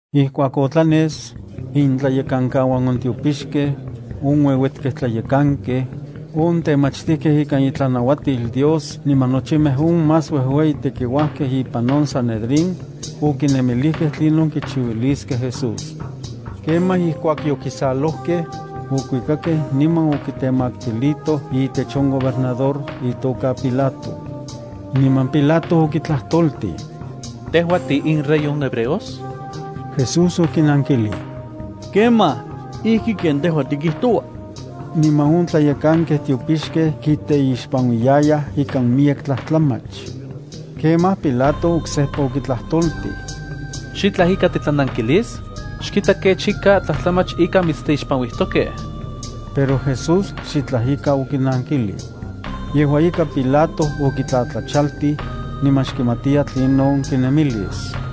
Ijkuak otlanes, intlayekankauan on tiopixkej, on ueuetkej tlayekankej, on temachtijkej ikan itlanauatil Dios niman nochimej on más uejueyi tekiuajkej ipan on sanedrín, okinemilijkej tlinon kichiuiliskej Jesús. Kemaj ijkuak yokisalojkej, okuikakej niman okitemaktilitoj itech on gobernador itoka Pilato. Niman Pilato okitlajtoltij: —¿Tejua tiinrey on hebreos? Jesús okinankilij: —Kemaj, ijki ken tejua tikijtoua. Niman on tlayekankej tiopixkej kiteixpanuiyayaj ikan miyek tlajtlamach. Kemaj Pilato oksejpa okitlajtoltij: —¿Xitlaj ika titlanankilis? Xkita kech ika tlajtlamach ika mitsteixpanuijtokej. Pero Jesús xitlaj ika okinankilij. Yejua ika Pilato okitlatlachaltij, niman xkimatiya tlinon kinemilis.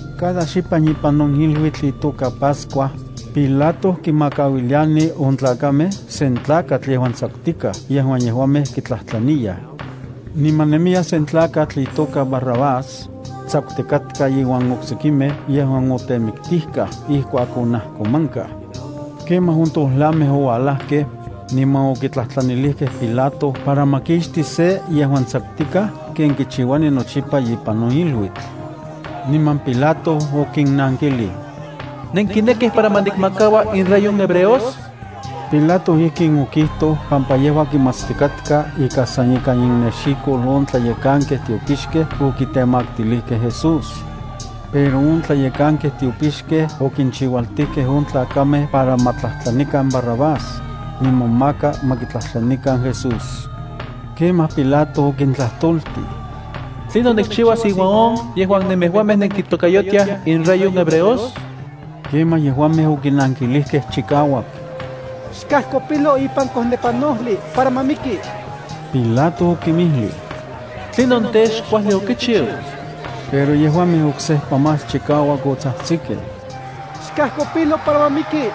Cada xipan ipan on iluitl itoka Pascua, Pilato kinmakauiliani on tlakamej sen tlakatl yejuan tsakutika yejuan yejuamej kitlajtlaniyaj. Niman nemiya sen tlakatl itoka Barrabás, tsakutikatka iuan oksekimej yejuan otemiktijkaj ijkuak onajkomankaj. Kemaj on tojlamej oualajkej, niman okitlajtlanilijkej Pilato para ma kixti sen yejuan tsakutikaj ken kichiuani nochipa ipan on iluitl. Niman Pilato okinnankilij: —¿Nenkinekij para ma nikmakaua inRey on hebreos? Pilato ijkin okijtoj pampa yejua kimatstikatka ika san ikan innexikol on tlayekankej tiopixkej okitemaktilijkej Jesús. Pero on tlayekankej tiopixkej okinchiualtijkej on tlakamej para ma tlajtlanikan Barrabás, niman maka ma kitlajtlanikan Jesús. Kemaj Pilato okintlajtoltij: —¿Tlinon nikchiuas iuan on yejuan nemejuamej nenkitokayotiaj inRey on hebreos? Kemaj yejuamej okinankilijkej chikauak: —¡Xkajkopilo ipan kojnepanojli para ma miki! Pilato okinmijlij: —¿Tlinon tej, xkuajli okichiu? Pero yejuamej oksejpa más chikauak otsajtsikej: —¡Xkajkopilo para ma miki!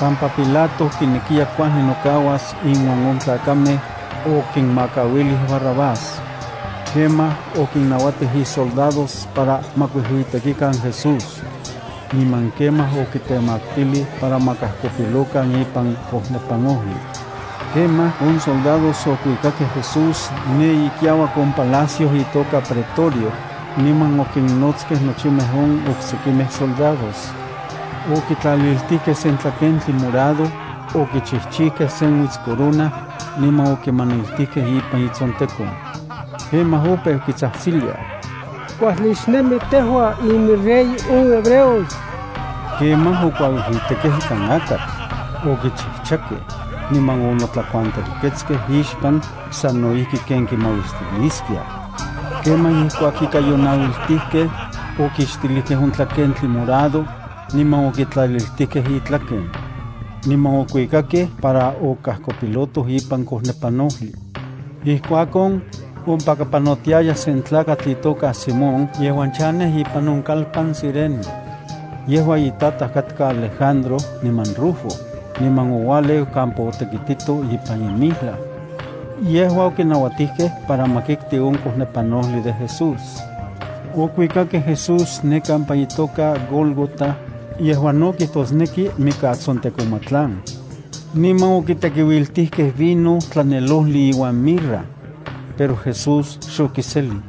Pampa Pilato kinekiya kuajli nokauas inuan on tlakamej, okinmakauilij Barrabás. Kemaj okinnauatij isoldados para ma kuijuitekikan Jesús. Niman kemaj okitemaktilij para ma kajkopilokan ipan kojnepanojli. Kemaj, on soldados okuikakej Jesús ne ikiauak on palacio itoka pretorio, niman okinnotskej nochimej on oksekimej soldados. Okitlaliltijkej sen tlakentli morado, okichijchijkej sen uitscorona, niman okimaniltijkej ipan itsontekon. Kemaj opeu kitsajtsiliaj: —¡Kuajli xnemi tejua iminRey on hebreos! Kemaj okuauijuitekej ikan akatl, okichijchakej, niman onotlakuantelketskej ixpan sano ijki ken kimauistiliaskiaj. Kemaj ijkuak ika yonauiltijkej, okixtilijkej on tlakentli morado, niman okitlaliltijkej itlaken. Niman okuikakej para okajkopilotoj ipan kojnepanojli. Ijkuakon, ompaka panotiaya sen tlakatl itoka Simón yejuan chanej on kalpan Cirene. Yejua itataj katka Alejandro niman Rufo, niman oualeu neka ipan campo. Yejua okinauatijkej para ma kikti on kojnepanojli de Jesús. Okuikakej Jesús ne kampa itoka Gólgota, yejuan no kijtosneki Mikatsontekomatlan. Niman okitekiuiltijkej vino tlanelojli iuan mirra. Pero Jesús xokiselij.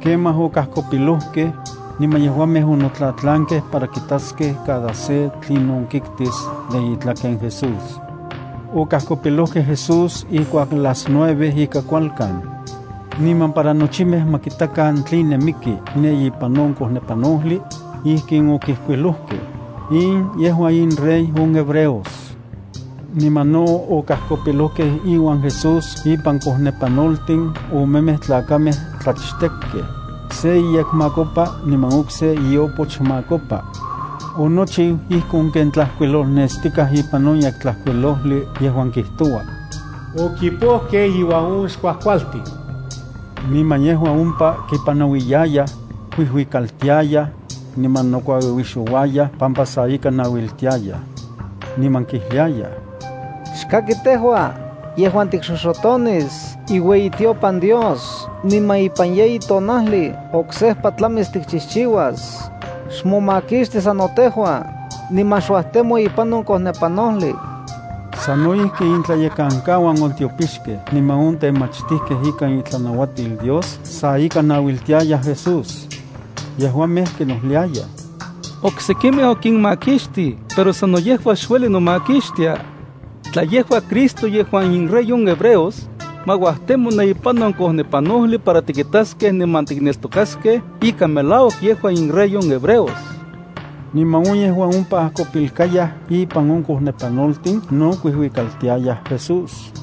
Kemaj okajkopilojkej, niman yejuamej onotlatlankej para kitaskej cada se tlinon kiktis de itlaken Jesús. Okajkopilojkej Jesús ijkuak las nueve ika kualkan. Niman para nochimej ma kitakan tline miki ne ipan on kojnepanojli, ijkin okijkuilojkej: “In yejua inRey on hebreos.” Niman no okajkopilojkej iuan Jesús ipan kojnepanoltin omemej tlakamej tlachtekkej, se iyekmakopa niman okse ioopochmakopa. Onochiu ijkon ken tlajkuilolnestikaj ipan on Yektlajkuilojli yejuan kijtoua: “Okipojkej inuan on xkuajkualtin.” Niman yejuan ompa kipanauiyayaj, kuijuikaltiayaj, niman nokuauiuixouayaj pampa sa ika nauiltiayaj. Niman kijliayaj: —¡Aj! Tejua yejuan tikxoxotonis iueyitiopan Dios niman ipan yeyi tonajli oksejpa tlamis tikchijchiuas, xmomakixti sano tejua, niman xuajtemo ipan on kojnepanojli. Sano ijki intlayekankauan on tiopixkej niman on temachtijkej ikan itlanauatil Dios sa ika nauiltiayaj Jesús. Yejuamej kinojliayaj: —Oksekimej okinmakixtij, pero sano yejua xueli nomakixtia. Tla yejua Cristo yejuan inRey on hebreos, ma uajtemo ne ipan on kojnepanojli para tikitaskej niman tikneltokaskej ika melauak yejua inRey on hebreos. Niman on yejuan ompa ajkopilkayaj ipan on kojnepanoltin no kuijuikaltiayaj Jesús.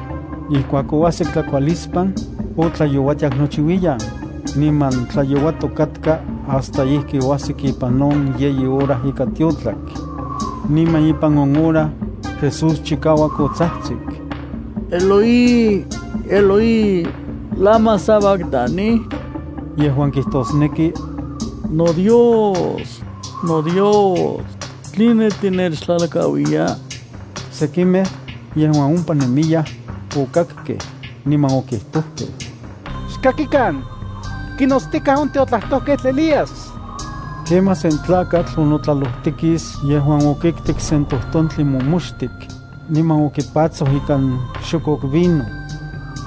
Ijkuak oajsik tlakualispan, otlayouatiak nochiuiyan, niman tlayouatok katka hasta ijki oajsik ipan yeyi hora ika tiotlak. Niman ipan on hora, Jesús chikauak otsajtsik: —Eloi, Eloi, ¿lama sabactani? —yejuan kijtosneki: NoDios, noDios, ¿tline tinechtlalkauiya? Sekimej, yejuan ompa nemiyaj, okakkej, niman okijtojkej: —Xkakikan. Kinotstikaj on tiotlajtojketl Elías. Kemaj sen tlakatl onotlalojtikis yejuan okiktik sen tojtontli momoxtik, niman okipatsoj ikan xokok vino.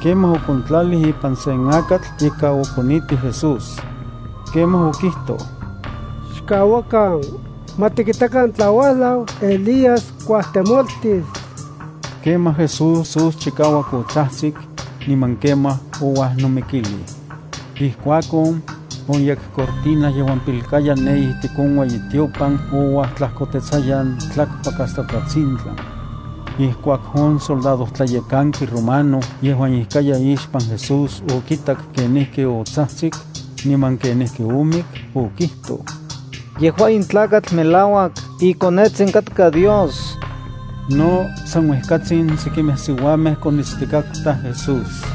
Kemaj okontlalij ipan sen akatl ika okonitij Jesús. Kemaj okijtoj: —Xkauakan, ma tikitakan tla uajlau Elías kuajtemoltis. Kemaj, Jesús chikauak otsajtsik, niman kemaj ouajnomikilij. Ijkuakon, on yekcortina yejuan pilkaya ne ijtik on ueyitiopan ouajtlajkotetsayan tlakpak hasta tlatsintlan. Ijkuak on soldadojtlayekanki romano yejuan ijkaya ixpan Jesús okitak kenijki otsajtsik, niman kenijki omik, okijtoj: —Yejua in tlakatl melauak iKonetsin katka Dios. No san uejkatsin sekimej siuamej konitstikatkaj Jesús.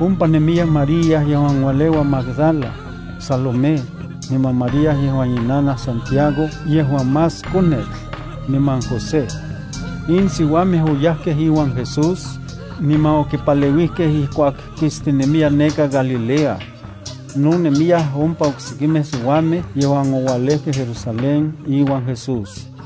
Ompa nemiya María yejuan ualeua Magdala, Salomé, niman María yejuan inanaj Santiago yejuan más konetl, niman José. In siuamej oyajkej iuan Jesús, niman okipaleuijkej ijkuak kistinemiya neka Galilea. No nemiyaj ompa oksekimej siuamej yejuan oualejkej Jerusalén iuan Jesús.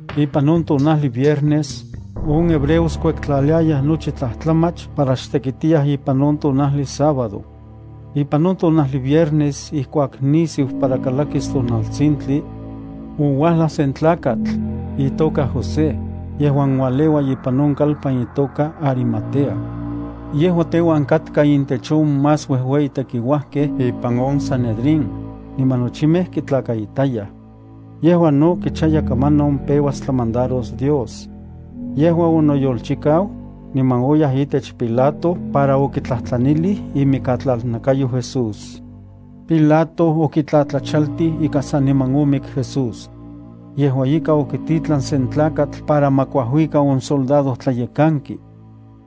Ipan on tonajli viernes, on hebreos kuektlaliayaj nochi tlajtlamach para xtekitiyaj ipan on tonajli sábado. Ipan on tonajli viernes, ijkuak nisiu para kalakis tonaltsintli, ouajlaj sen tlakatl, itoka José, yejuan ualeua ipan on kalpan itoka Arimatea. Yejua teuan katka intech on más uejueyi tekiuajkej ipan on sanedrín, niman nochimej kitlakaitayaj. Yejua no kichaya kamanon peuas tlamandaros Dios. Yejua onoyolchikau, niman oyaj itech Pilato para okitlajtlanilij imikatlalnakayo Jesús. Pilato okitlatlachaltij ika saniman omik Jesús. Yejua ika, okititlan sen tlakatl para ma kuajuika on soldadojtlayekanki.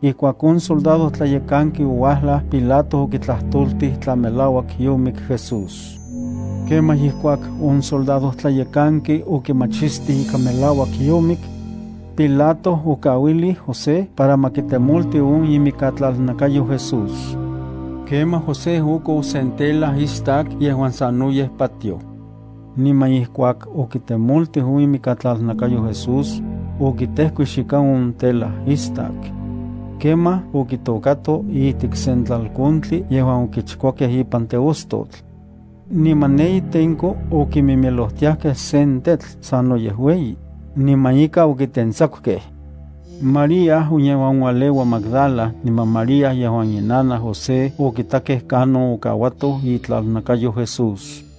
Ijkuak on soldadojtlayekanki ouajlaj, Pilato okitlajtoltij tla melauak yomik Jesús. Kemaj ijkuak on soldadojtlayekanki okimachistij ika melauak yomik, Pilato okauilij José para ma kitemolti on imikatlalnakayo Jesús. Kemaj José okou sen tela istak yejuan sanoyej patioj. Niman ijkuak okitemoltij on imikatlalnakayo Jesús, okitejkuix ikan on tela istak. Kemaj okitôkato ijtik sen tlalkontli yejuan okichkuakej ipan teostotl. Niman ne itenko okimimilojtiajkej sen tetl sanoyej ueyi, niman ika okitentsakukej. María on yejuan ualeua Magdala, niman María yejuan inanaj José okitakej kanon okauatoj itlalnakayo Jesús.